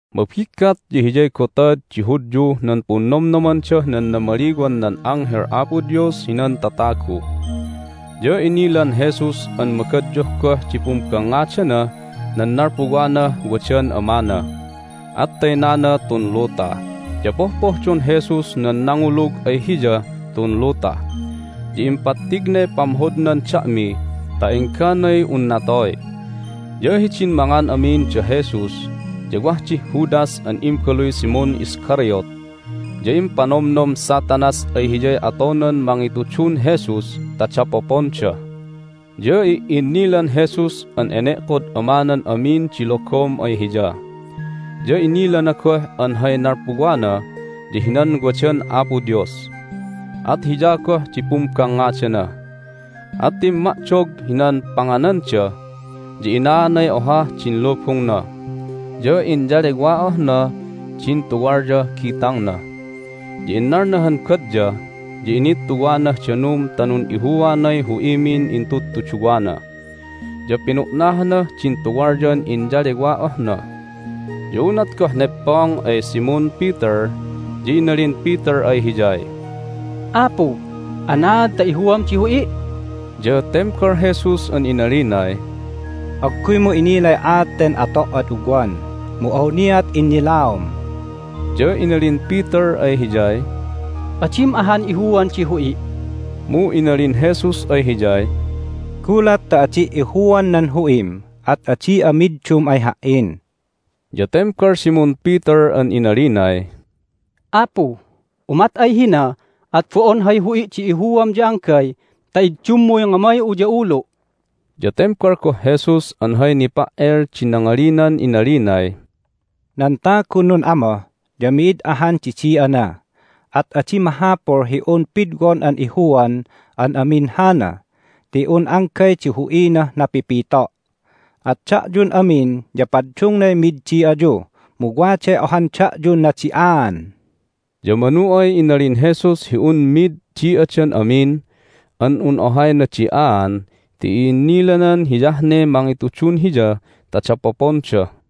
Mabiggat ya hiyay Gotad di Hudyuh nan Punnomnomandah nan Namaliwan nan Anghel Apo Dios hinan Tatagu. Ya inilan Jesus an magadyuh goh di pumbangngadanah nan nalpuwanah wadan Amana, at taynana tun luta. Ya pohpohdon Jesus nan nangulug ay Hiyah tun luta, ya impattignay pamhodnan da'mi ta engganay un natoy. Ya hidin mangan amin da Jesus ya wah dih Judas an imbaluy Simon Iscariot. Ya impanomnom Satanas ay hiyay atonan mangitudun Jesus ta dapoponda. Ya i'innilan Jesus an ene'kod Amanan amin di logom ay Hiya, ya inilana goh an hay nalpuwana ya hinan wadan Apo Dios, at Hiya goh di pumbangngadana. At timma'dog hinan pangananda, ya inaanay ohah din lubungna, ya inyalewa'ohna din tuwalyah gitangna. Ya innalna han batya, ya inittuwanah danum ta nun'ihuanay hu'imin intudtuduwana, ya pinu'nahanah din tuwalyan inyalewa'ohna. Ya unat goh negpong ay Simon Peter ya inalin Peter ay Hiyay, "Apu, anaad ta ihuam di hu'i'?" Ya tembal Jesus an inalinay, "Agguymu inilay aat ten ato' ad ugwan, mu awniat innilaom." Ya inalin Peter ay Hiyay, "Adim ahan ihuan di hu'i'!" Mu inalin Jesus ay hiyay, "Gulat ta adi' ihuan nan hu'im at adi'a middum ay Ha"in." Ya tembal Simon Peter an inalinay, "Apu, umat ay hina at bo'on hay hu'i' di ihuam ya anggay ta iddummuy ngamay'u ya ulu'!" Ya tembal goh Jesus an hay nipa"el di nangalinan inalinay, "Nan tagun nun'amoh ya mid ahan di di'ana, at adi mahapul hi un pidwon an ihuan an amin hana ti un anggay di hu'inah napipito'. At da'yun amin ya paddungnay mid di'ayu, mu waday ohan da'yun nadi'aan." Ya manu ay inalin Jesus hi un mid di'adan amin an un ohay nadi'aan ti i'innilanan hiyah ne mangitudun Hiya ta dapoponda.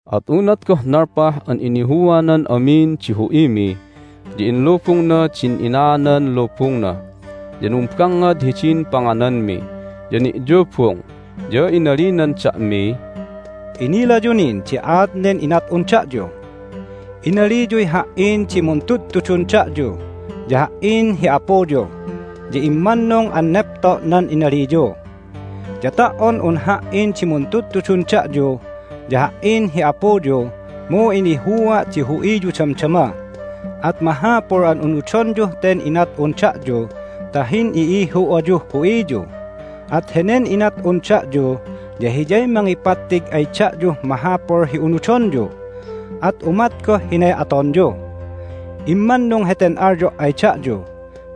At unat goh nalpah an inihuanan amin di hu'imi ya inlubungna din inaanan lubungna, ya numbangngad hidin pangananmi, ya ni'yubung. Ya inalinan da'miy, "Inilayu nin di aat nen inat'un da'yu? Inaliyuy Ha"in di muntudtudun da'yu, ya Ha"in hi apuyu, ya immannung an nepto' nan inaliyu. Ya ta"on un Ha"in di muntudtudun da'yu ya Ha"in hi apuyu mu inihua' di hu'iyu damdama. At mahapul an unudonyuh ten inat'un da'yu ta hin'i'ihu ayuh hu'iyu. At henen inat'un da'yu ya hiyay mangipattig ay da'yuh mahapul hi unudonyu, at umat goh hinay atonyu. Immannung heten alyo' ay da'yu: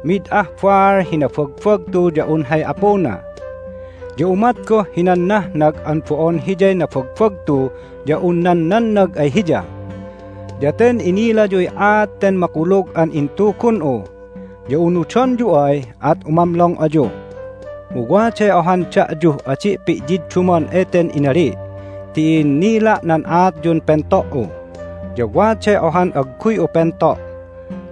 mid ah baal hi nabagbagtu ya un hay apuna. Ya umat goh hinan nahnag an bo'on hiyay nabagbagtu ya un nan nannag ay hiya. Ya ten inilayuy aat ten makulug an intugun'u, ya unudonyu ay at umamlong ayu. Mu waday ohan da'yuh adi' pi'yiddumon eten inali' ti i'innila' nan aatyun pento"u, ya waday ohan agguy'u pento'.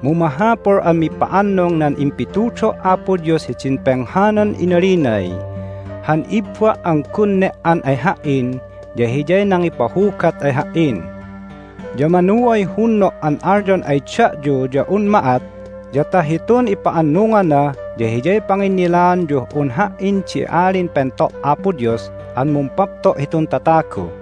Mu mahapul an mipa'annung nan impitudo' Apo Dios hidin penghanan inalinay, Han ibba' an gun ne"an ay Ha"in ya hiyay nangipahugat ay Ha"in. Ya manu ay hunno' an alyon ay da'yu ya un ma'at ya ta hitun ipa'annungana ya hiyay panginnilaanyuh un Ha"in di Alin Pento' Apo Dios an mumpapto' hitun tatagu.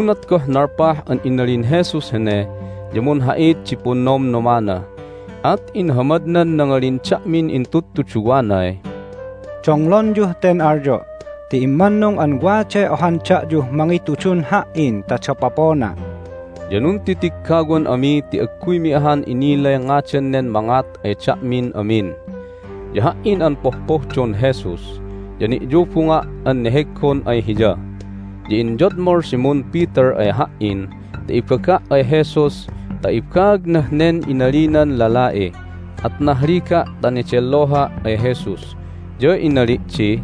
Unat goh nalpah an inalin Jesus hene ya munha'it di punnomnomana, at inhamadnan nangalin da'min intudtuduwanay, "Donglonyuh ten alyo' ti immannung an waday ohan da'yuh mangitudun Ha"in ta dapopona'." Ya nuntitiggawan ami ti agguymi ahan inilay ngadan nen mangat ay da'min amin. Ya ha"in an pohpohdon Jesus, ya ni'yubunga' an neheggon ay Hiya. Ya inyodmol Simon Peter ay ha"in ta ibaga' ay Jesus ta ibaagnah nen inalinan lala'i. At nahliga' ta nedelloha' ay Jesus, ya inali' di,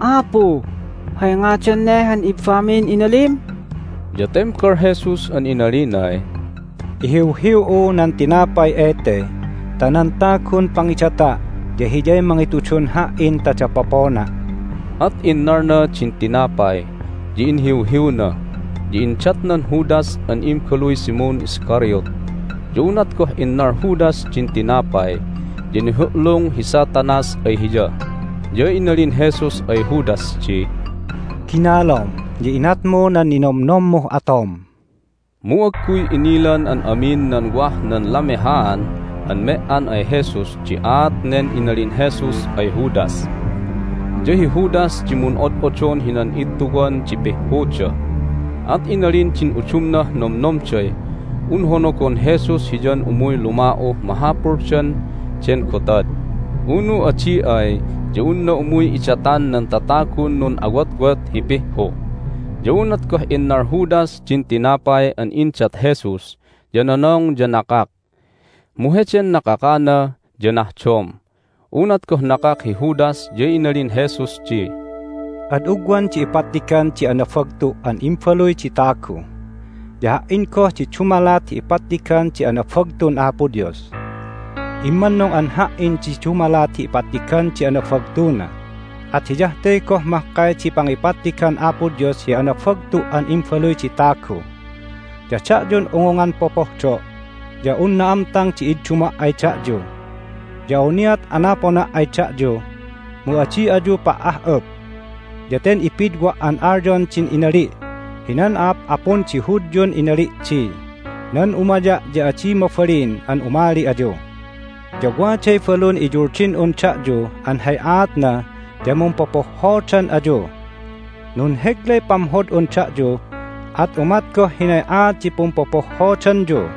"Apu, hay ngadan ne han ibbamin inalim?" Ya tembal Jesus an inalinay, "Ihiwhiw'u nan tinapay ete ta nan tagun pangidata' ya hiyay mangitudun Ha"in ta dapopona'." At innalna din tinapay, ya inhiwhiwna, ya indatnan Judas an imbaluy Simon Iscariot. Ya unat goh innal Judas din tinapay ya nihu'lung hi Satanas ay hiya. Ya inalin Jesus ay Judas di, "Ginalom, ya inatmu nan ninonomnommuh atom." Mu agguy inilan an amin nan wah nan lamehaan an me"an ay Jesus di aat nen inalin Jesus ay Judas. Ya hi Judas di mun'od'odon hinan ittuwan di pihhuda, at inalin din udumnah nomnomday un honogon Jesus hiyan umuy luma'uh mahapuldan den gotad, unu adi ay ya unna umuy idatan nan tatagun nun'awotwot hi pihhu. Ya unat goh innal Judas din tinapay an indat Jesus ya nonong ya nakak, mu heden nakakana ya nahdom. Nan Balun Uldin Jesus Unat goh nakak hi Judas ya inalin Jesus di, "Ad ugwan di ipattigan di anabagtu' an Imbaluy di Tagu. Ya Ha"in goh di dumalat hi ipattigan di anabagtun Apo Dios. Immannung an Ha"in di dumalat hi ipattigan di anabagtuna, at hiyah te goh mahkay di pangipattigan Apo Dios hi anabagtu' an Imbaluy di Tagu. Ya da'yun ungungan popohdo', ya un na'amtang di idduma' ay da'yu. Ya awniat anapona' ay da'yu, mu adi ayu pa"ah'up. Ya ten ipidwa' an alyon din inali' hinan a'ap'apun di Hudyun inali' di, Nan umaya' ya adi mabalin an umali ayu. Ya waday balun iyuldin'un da'yu an hay aatna ya mumpopohhodan ayu. Nunheglay pamhod'un da'yu, at umat goh hinay aat di pumpopohhodanyu.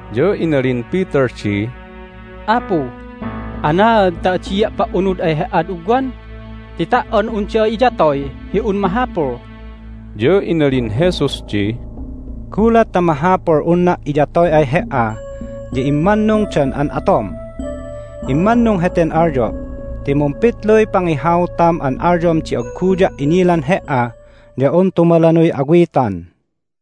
Ya inalin Peter di, "Apu, anaad ta adia' pa"unud ay He"ad ugwan? Ti ta"on un da'a iyatoy hi un mahapul!" Ya inalin Jesus di, "Gulat ta mahapul unna' iyatoy ay he"a ya immannung dan an atom? Immannung heten alyo' ti mumpitluy pangihautam an alyom di agguya' inilan he"a ya un tumalanuy awitan."